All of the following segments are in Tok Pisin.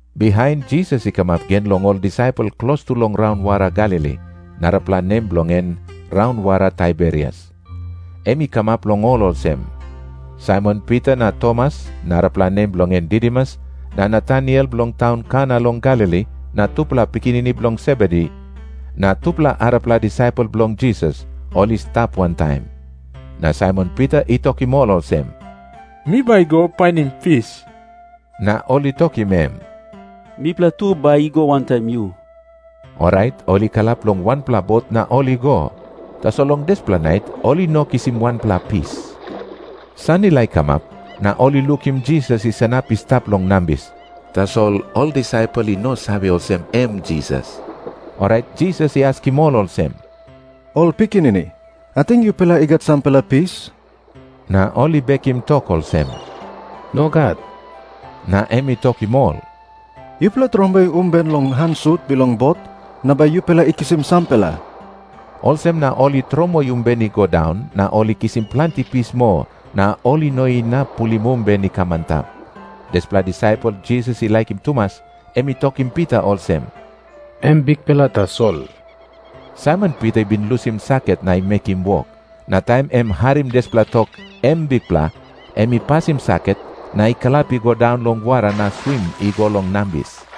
Bihain Jisas i kamap gen long ol disaipel klostu long raunwara Galili, narapela nem bilong en raunwara Taiberias. Em i kamap long ol olsem. Saimon Pita na Tomas, narapela nem bilong en Didimus, na Nataniel bilong taun Kana long Galili, na tupela pikinini bilong Sebedi, na tupela arapela disaipel bilong Jisas, ol i stap wantaim. Na Saimon Pita i tokim ol olsem, “Mi bai go painim pis.” Na ol i tokim em, “Mipela tu bai i go wantaim yu.” Orait ol i kalap long wanpela bot na ol i go. Tasol long dispela nait ol i no kisim wanpela pis. San i laik kamap, na ol i lukim Jisas i sanap i stap long nambis. Tasol ol disaipel i no save olsem, em Jisas. Orait Jisas i askim ol olsem, “Ol pikinini, ating yupela i gat sampela pis?” Na ol i bekim tok olsem, “Nogat.” Na em i tokim ol, “Yupela tromoi umben long han sut bilong bot, na bai yupela i kisim sampela.” Olsem na ol i tromoi umben i go daun, na ol i kisim planti pis moa, na ol i no inap pulim umben i kam antap. Dispela disaipel Jisas i laikim tumas, em i tokim Pita olsem, “Em Bikpela tasol.” Saimon Pita i bin lusim saket na i mekim wok. Na taim em i harim dispela tok, “Em Bikpela,” em i pasim saket na i kalap i go daun long wara na swim i go long nambis.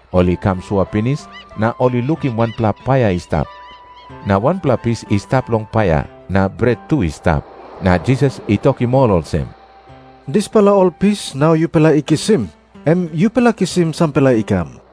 Ol i kam sua pinis, na ol i lukim wanpela paia i stap. Na wanpela pis i stap long paia, na bret tu i stap. Na Jisas i tokim ol olsem, “Dispela ol pis nau yupela i kisim, em yupela kisim sampela i kam.”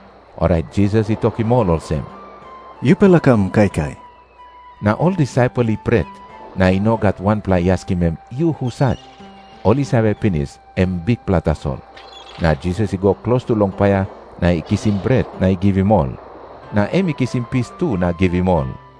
Orait Jisas i tokim ol olsem, “Yupela kam kaikai.” Na ol disaipel i pret, na i no gat wanpela i askim em, “Yu husat?” Ol i save pinis, em Bikpela tasol. Na Jisas i go klostu long paia na i kisim bret na i givim ol. Na em i kisim pis tu na givim ol.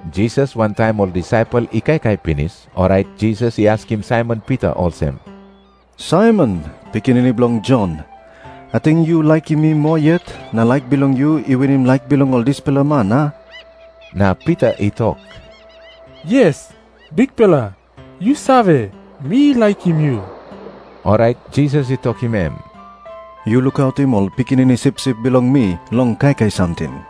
Jisas wantaim ol disaipel i kaikai pinis, orait Jisas i askim Saimon Pita olsem, “Saimon, pikinini bilong Jon, ating yu laikim mi moa yet na laik bilong yu i winim laik bilong ol dispela man, a?” Na Pita i tok, “Yes, Bikpela, yu save, mi laikim yu.” Orait Jisas i tokim em, “Yu lukautim ol pikinini sipsip bilong mi long kaikai samting.”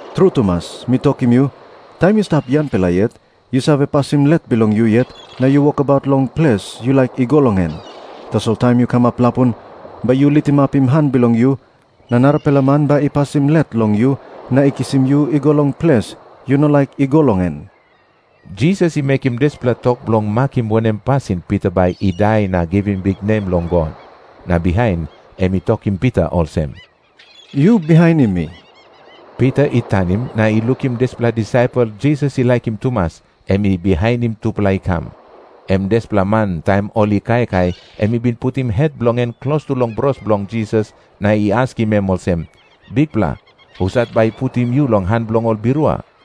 “Tru tumas mi tokim yu, taim yu stap yangpela yet, yu save pasim let bilong yu yet na yu wokabaut long ples yu laik i go long en. Tasol taim yu kamap lapun, bai yu litimapim han bilong yu, na narapela man bai i pasim let long yu na i kisim yu i go long ples yu no laik i go long en.” Jisas i mekim dispela tok bilong makim wanem pasin Pita bai i dai na givim biknem long God. Na bihain em i tokim Pita olsem, “Yu bihainim mi.” Pita i tanim na i lukim dispela disaipel Jisas i laikim tumas, em i bihainim tupela i kam. Em dispela man taim ol i kaikai em i bin putim het bilong en klostu long bros bilong Jisas na i askim em olsem, “Bikpela, husat bai i putim yu long han bilong ol birua?”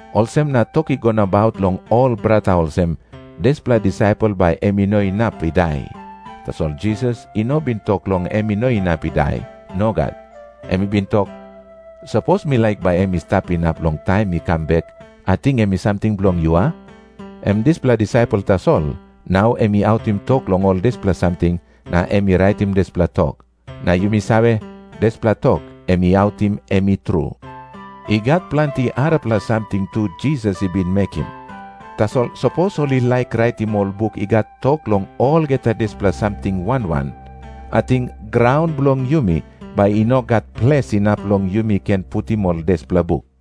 Olsem na tok i go nabaut long ol brata olsem, “Dispela disaipel bai em i no inap i dai.” Tasol Jisas i no bin tok long em i no inap i dai. Nogat. Em i bin tok, “Sapos mi laik bai em i stap inap long taim mi kam bek, ating em i samting bilong yu, a?” Em dispela disaipel tasol, nau em i autim tok long ol dispela samting, na em i raitim dispela tok. Na yumi save, dispela tok em i autim em i tru. I gat planti arapela samting tu Jisas i bin mekim. Tasol sapos ol i laik raitim ol buk i gat tok long olgeta dispela samting wan wan, ating graun bilong yumi bai i no gat ples inap long yumi ken putim ol dispela buk.